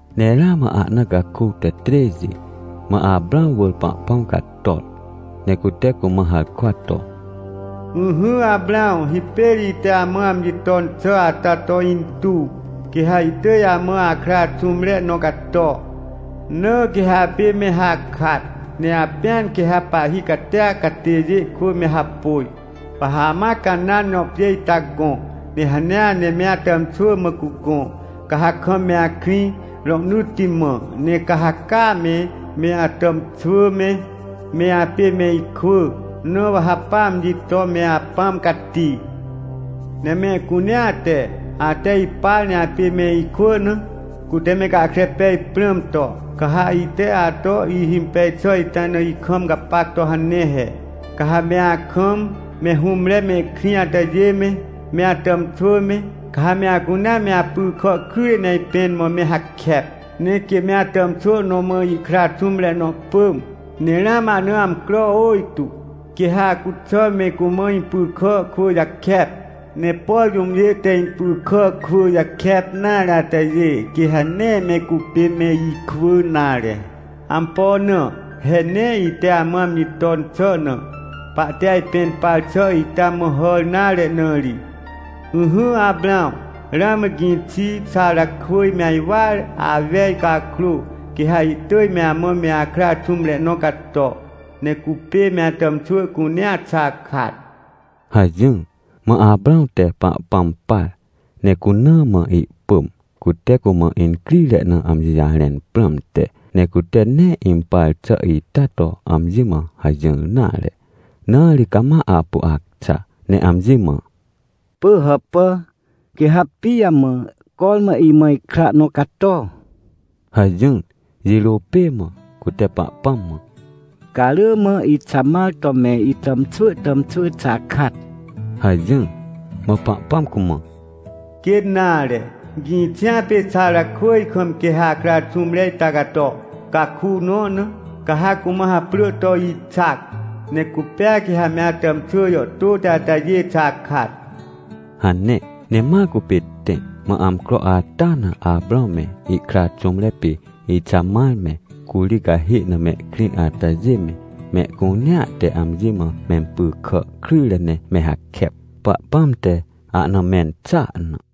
Ne ramã ahna caku te trêxi, mã Aprãw wỳr Pahpãm cator, ne cute cumã harkwa to: — Ỹhỹ, Aprãw, hipêr ite amã amji ton xà ata to intuw, quê ha ihtỳj amã akra xũmre nõ cato. Na quê ha apê me hakat, ne apĩan quê ha pahhi catia catêjê kwỳ me hapôj. Wa ha amã Canãn jõ pjê ita gõ, ne hanea ne me atàmxwỳ mã cugõ, ca ha kam me akrĩ rohnỳtti mã. Ne ca ha caa me, me atàmxwỳ me, me apê me ikwỳ, na wa ha pa amji to me Apãm Cati. — Ne mehcunea te, ate ipar ne apê me ikwỳ na, cute me gahkre pej prãm to, ca ha ite ato ihimpej xà ita na ikam gapac to hane he. Ca ha me akam, me hũmre mehkrĩ atajê me, me atàmxwỳ me, ca ha me acunea me apy kà kryjre ne ajpẽn mã me hakep. Ne quê me atàmxwỳ nõ mã ihkra xũmre nõ pỳm, ne ramã ahna amcro ôjtô, quê ha acuxà me cumã impy kà kwỳ jakep. Ne por jũmjê te impy kà kwỳ jakep nare atajê quê ha nee me cupê me ikwỳ nare. Ampo na? He nee ite amã amji ton xà na, pahte ajpẽn par xà ita mã hàr nare na ri. — Ỹhỹ, Aprãw, ramã gĩxi Xarakwỳj me ajwar awej cakrô, quê ha ihtỳj me amã me akra xũmre nõ cato. Ne cupê me atàmxwỳ cunea xakat — hajỹr. Mã Aprãw te Pahpãm par, ne cuna mã ihpỳm, cute cumã incrire na amji jarẽn prãmte. Ne cute nee impar xà ita to amji mã hajỹr nare, na ri cama apu acxa, ne amji mã: — Pỳhàpà, quê ha pijamã cormã imã ikra nõ cato? — hajỹr jirô pê mã, cute Pahpãm mã: — Ca rỳ mã Ixamar to me itàmxwỳ tàmxwỳ xakat — hajỹr. Mã Pahpãm cumã: — Quê nare! Gĩxia pê Xarakwỳj kam quê ha akra xũmre ita cato, caku nõ na, ca ha cumã haprỳ to Ixac. Ne cupêa quê ha me atàmxwỳ jàhtôti atajê xakat — hane. Ne ma cupê tẽ. Mã amcro ata na Aprãw me ihkra xũmre pê Ixamar me, curi cahê na mehkrĩ atajê me, mehcunea te amji mã mempy kà kryjre ne me hakep, Pahpãm te ahna mẽn xàa na.